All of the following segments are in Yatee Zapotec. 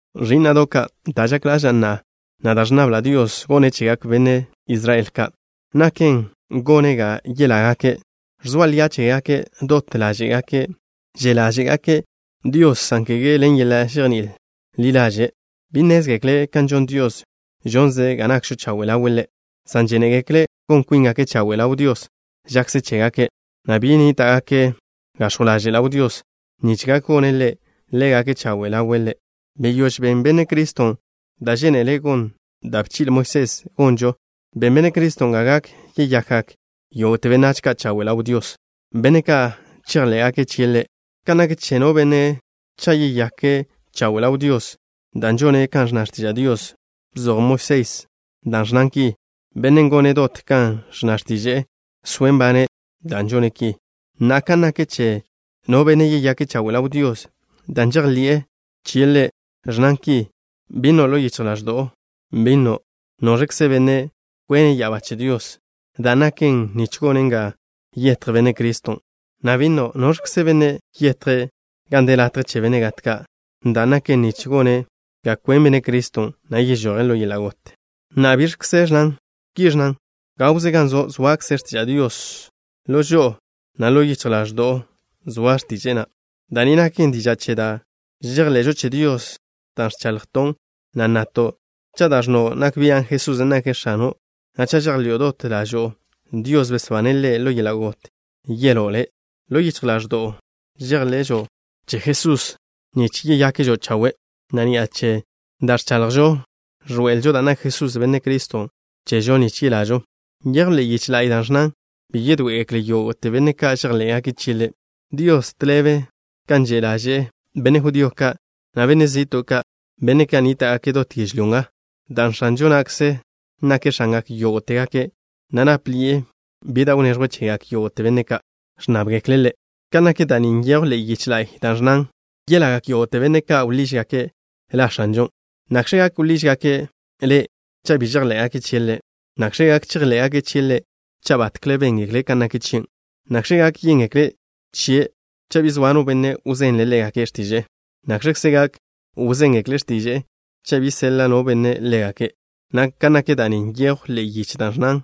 Ẕí'na'do' ka', da' žak ḻaža'a, na' da' ẕnnabla' Dios gone' chegak benách Israel ka', naken gone' ga yelágake'. Ẕzoa lia' chégake', dot ḻáže'gake' že' ḻáže'gake' Dios, san kege ḻen yeḻa' žejní'il ḻi ḻaže'. Bi nnézgekle' kan žon Dios, žonze' ga nakžo chawe' ḻawe' Ḻe', san žénegekle' gon kwíngake' chawe' ḻaw Dios žakze chégake', na' bi nníta'gake' gax̱jw ḻaže' ḻaw Dios nich gak gone' Ḻe' ḻégake' chawe' ḻawe' Ḻe'. Beyóž ben Benne' Criston' da' žénele gon da' bchi'le Moisés gonžo. Ben benne' Criston' ga gak yeyakgak yógo'te benách ka' chawe' ḻaw Dios, benne' ka' chejḻé'gake' chie' Ḻe'. Kan nak che no benne' cha' yeyake' chawe' ḻaw Dios dan' žone' kan ẕnna x̱tiža' Dios, bzoj Moisés da' ẕnnan ki: “Bennen' gone' dot kan ẕnna x̱tiže'e, soe' nbane' dan' žone' ki.” Na'a, kan nak che no benne' yeyake' chawe' ḻaw Dios dan' žejḻi'e chie' Ḻe', ẕnnan ki: “Bi nno' ḻo yichj ḻaẕdo'o, bi nno': ¿Noẕkze benne' kwene' ya'abá che Dios? (dan' naken: nich gone' ga yetj Benne' Criston'), na' bi nno': ¿Noẕkze benne' yetje' gan de latje che benne' gat ka'? (dan' naken, nich gone' ga kwen Benne' Criston', na' yežoje' ḻo yeḻa' got).” Na'a, ¿biẕkze ẕnnan? Ki ẕnnan: “Gawze gan zo' zoakze x̱tiža' Dios. Ḻo žo'o, na' ḻo yichj ḻaẕdo'o zoa x̱tiže'e na'.” Da' ni naken diža' che da' žejḻe'žo che Dios dan' ẕchaḻjton', na' ẕnnato': “Cha' da' ẕnno' nak bian' Jesusen' nake' X̱ano', na' cha' žejḻi'o dot ḻažo'o Dios besbane' Ḻe' ḻo yeḻa' got, yeló' le'.” Ḻo yichj ḻáẕdo'žo žejḻe'žo che Jesusen' nich yeyakžo chawe', na' ni'a che da' ẕchaḻjžo, ẕḻoe'elžo dan' nak Jesusen', Benne' Criston', chežo nich yelažo. Nyejw ḻe'e yiche la'y da' ẕnnan: “Bi yedoé'egekle yógo'te benne' ka' žejḻé'gake' chie' Ḻe'.” Dios, tḻebe kan že' ḻaže'e benne' judío ka', na' benne' zi'to' ka', benne' ka' nníta'gake' dot yežlyó nga, dan' X̱anžo na'kze nake' X̱angak yógo'tegake', na' nápḻi'e bi da' wneẕjwe' chegak yógo'te benne' ka' ẕnnábgekle' Ḻe'. Kan nak da' ni nyejw ḻe'e yiche la'y da' ẕnnan: “Yelagak yógo'te benne' ka' wḻížgake' La X̱anžon'.” ¿Nakx̱ gak wḻížgake' Ḻe' cha' bi žejḻé'gake' chie' Ḻe'? ¿Nakx̱ gak chejḻé'gake' chie' Ḻe' cha' batkle béngekle' kan nak chie'? ¿Nakx̱ gak yéngekle' chie' cha' bi zoa no benne' wzenle' ḻégake' x̱tiže'e? ¿Nakx̱kze gak wzéngekle' x̱tiže'e cha' bi seḻa' no benne' ḻégake'? Kan nak da' ni nyejw ḻe'e yiche da' ẕnnan: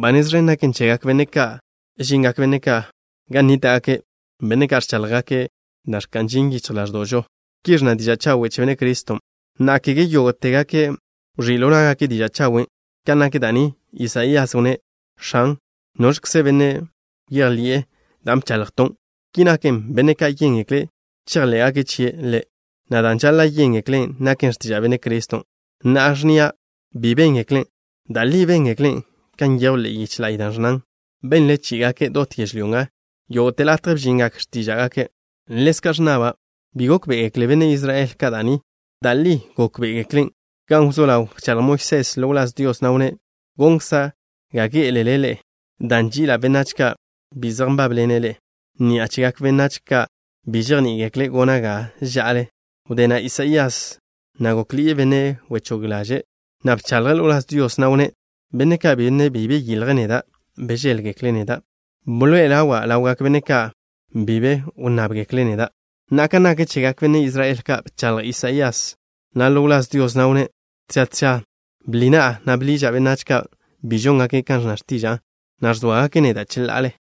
“Ba nez ẕen gaken chegak benne' ka' žingak benne' ka' gan nníta'gake', benne' ka' ẕcháḻjgake' da' ẕka'n ži yichj ḻáẕdo'žo.” Ki ẕnna diža' chawe' che Benne' Criston'. Na'a, kege yógo'tegake' wẕí' ḻo ná'gake' diža' chawen'. Kan nak da' ni, Isaías wnné': “X̱an, ¿noẕkze benne' bejḻi'e da' bchaḻjton'?” Ki naken, benne' ka' yéngekle' chejḻé'gake' chie' Ḻe', na' dan' žaḻa' yéngeklen' naken x̱tiža' Benne' Criston'. Na'a ẕnnia': “¿Bi béngeklen'?” Da' li béngeklen', kan nyejw ḻe'e yiche la'y da' ẕnnan: Benle chí'igake' dot yežlyó nga. Yógo'te latje bžingak x̱tíža'gake'. Ḻezka' ẕnnaba': “¿Bi gókbe'egekle benne' Israel ka' da' ni?” Da' li gókbe'egeklen'. Gan wzó ḻaw, bchaḻj Moisés ḻo wláz Dios, na' wnné': Gonkza' ga gé'elele ḻe'e, dan' ži'ila' benách ka' bi zej nbábḻene' ḻe'e. Ni'a chegak benách ka' bi žejní'igekle' gona' ga ža'ale. Wdé na' Isaías na' gókḻi'e benne' wechóg ḻaže', na' bchaḻje' ḻo wláz Dios, na' wnné': Benne' ka', benne' bi bdíljgake' neda', bžéḻgekle' neda'. Bḻoe'e ḻawa' ḻawgak benne' ka' bi be wnnábgekle' neda'. Na'a, kan nak chegak benne' Israel ka', bchaḻj Isaías na' ḻo wláz Dios, na' wnné': “Tža tža bḻi na'a, na' bḻiža' benách ka' bi žóngake' kan ẕnna x̱tiža'a, na' ẕzóagake' neda' cheḻa'ale.”